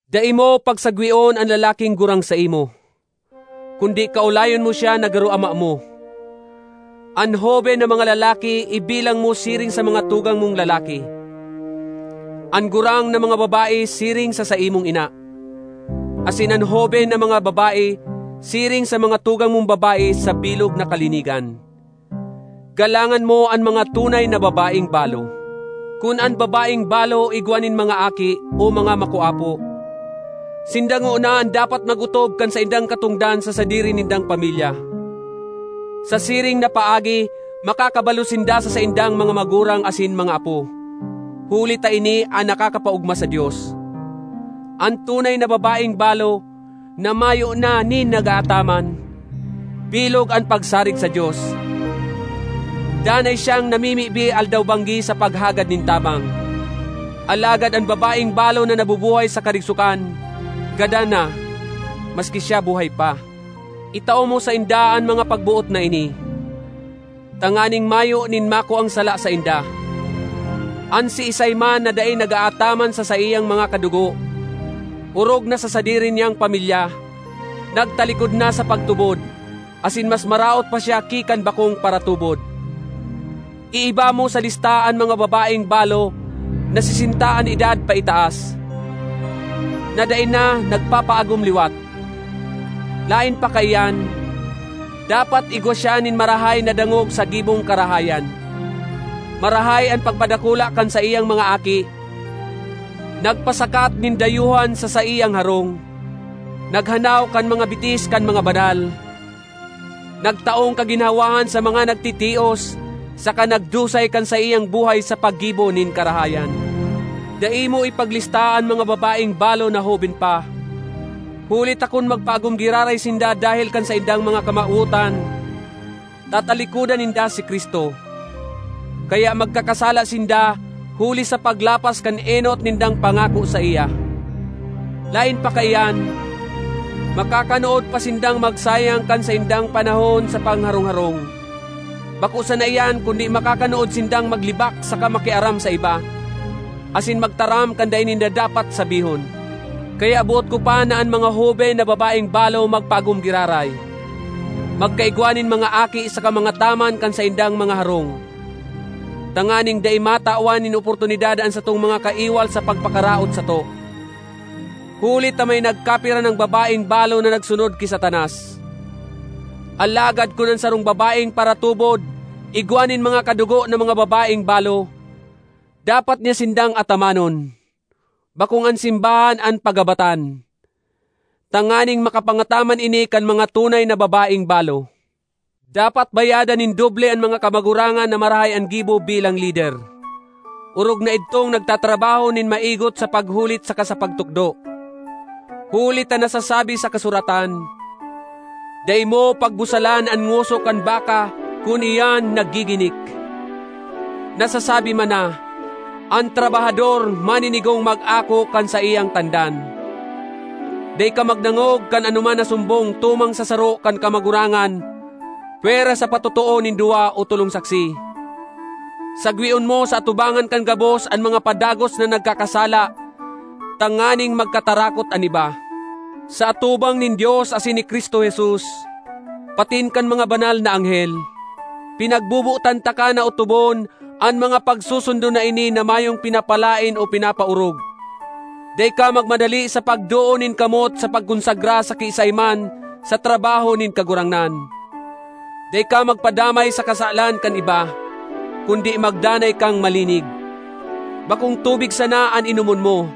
Dai mo pagsagweon an lalaking gurang saimo, kundi kaolayon mo siya na garo ama mo; an hoben na mga lalaki ibilang mo siring sa mga tugang mong lalaki, an gurang na mga babae siring sa saimong ina, asin an hoben na mga babae siring sa mga tugang mong babae, sa bilog na kalinigan. Galangan mo an mga tunay na babaeng balo. Kun an babaeng balo igwa nin mga aki o mga makoapo, sinda ngona an dapat mag-otob kan saindang katongdan sa sadiri nindang pamilya. Sa siring na paagi makakabalos sinda sa saindang mga magurang asin mga apo, huli ta ini an nakakapaogma sa Dios. An tunay na babaeng balo na mayo na nin nag-aataman, bilog an pagsarig sa Dios; danay siyang namimibi aldaw-banggi sa paghagad nin tabang. Alagad an babaeng balo na nabubuhay sa karigsokan, gadan na, maski siya buhay pa. Itao mo sainda an mga pagboot na ini, tanganing mayo nin makuang sala sainda. An siisay man na dai nag-aataman sa saiyang mga kadugo, orog na sa sadiri niyang pamilya, nagtalikod na sa pagtubod asin mas maraot pa siya ki kan bakong paratubod. Iiba mo sa lista an mga babaeng balo na sesenta an edad paitaas, na dai na nagpapaagom liwat. Laen pa kaiyan, dapat igwa siya nin marahay na dangog sa gibong karahayan: marahay an pagpadakula kan saiyang mga aki, nagpasakat nin dayuhan sa saiyang harong, naghanaw kan mga bitis kan mga banal, nagtaong kaginhawahan sa mga nagtitios, saka nagdusay kan saiyang buhay sa paggibo nin karahayan. Dai mo ipaglista an mga babaeng balo na hoben pa; huli ta kun magpaagom giraray sinda dahel kan saindang mga kamawotan, tatalikodan ninda si Cristo. Kaya magkakasala sinda huli sa paglapas kan enot nindang pangako saiya. Laen pa kaiyan, makakanood pa sindang magsayang kan saindang panahon sa pangharong-harong; bako sana iyan kundi makakanood sindang maglibak saka makiaram sa iba, asin magtaram kan dai ninda dapat sabihon. Kaya boot ko pa na an mga hoben na babaeng balo magpaagom giraray, magkaigwa nin mga aki, saka mangataman kan saindang mga harong, tanganing dai matawan nin oportunidad an satong mga kaiwal sa pagpakaraot sato. Huli ta may nagkapira nang babaeng balo na nagsunod ki Satanas. Alagad kun an sarong babaeng paratubod igwa nin mga kadugo na mga babaeng balo, dapat niya sindang atamanon, bakong an simbahan an pagabatan, tanganing makapangataman ini kan mga tunay na babaeng balo. Dapat bayadan nin doble an mga kamagurangan na marahay an gibo bilang lider, orog na idtong nagtatrabaho nin maigot sa paghulit saka sa pagtukdo. Huli ta nasasabi sa kasuratan, “Dai mo pagbusalan an ngoso kan baka kun iyan naggiginik.” Nasasabi man na, “An trabahador maninigong mag-ako kan saiyang tandan.” Dai ka magdangog kan anoman na sumbong tumang sa saro kan kamagurangan pwera sa patotoo nin duwa o tolong saksi. Sagweon mo sa atubangan kan gabos an mga padagos na nagkakasala tanganing magkatarakot an iba. Sa atubang nin Dios asin ni Cristo Jesus, patin kan mga banal na anghel, pinagbobotan taka na otobon an mga pagsusundon na ini na mayong pinapalaen o pinapaorog. Dai ka magmadali sa pagdoon nin kamot sa pagkonsagra sa kiisay man sa trabaho nin Kagurangnan. Dai ka magpadamay sa kasalan kan iba, kundi magdanay kang malinig. Bakong tubig sana an inomon mo,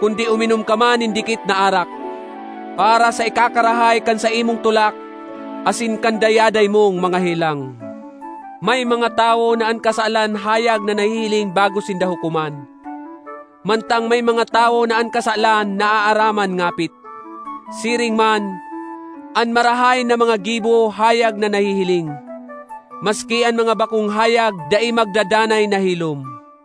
kundi uminom ka man nin dikit na arak, para sa ikakarahay kan saimong tulak asin kan dayaday mong mga helang. May mga tawo na an kasalan hayag na nahihiling bago sinda hukoman; mantang may mga tawo na an kasalan naaaraman ngapit. Siring man, an marahay na mga gibo hayag na nahihiling; maski an mga bakong hayag dai magdadanay na hilom.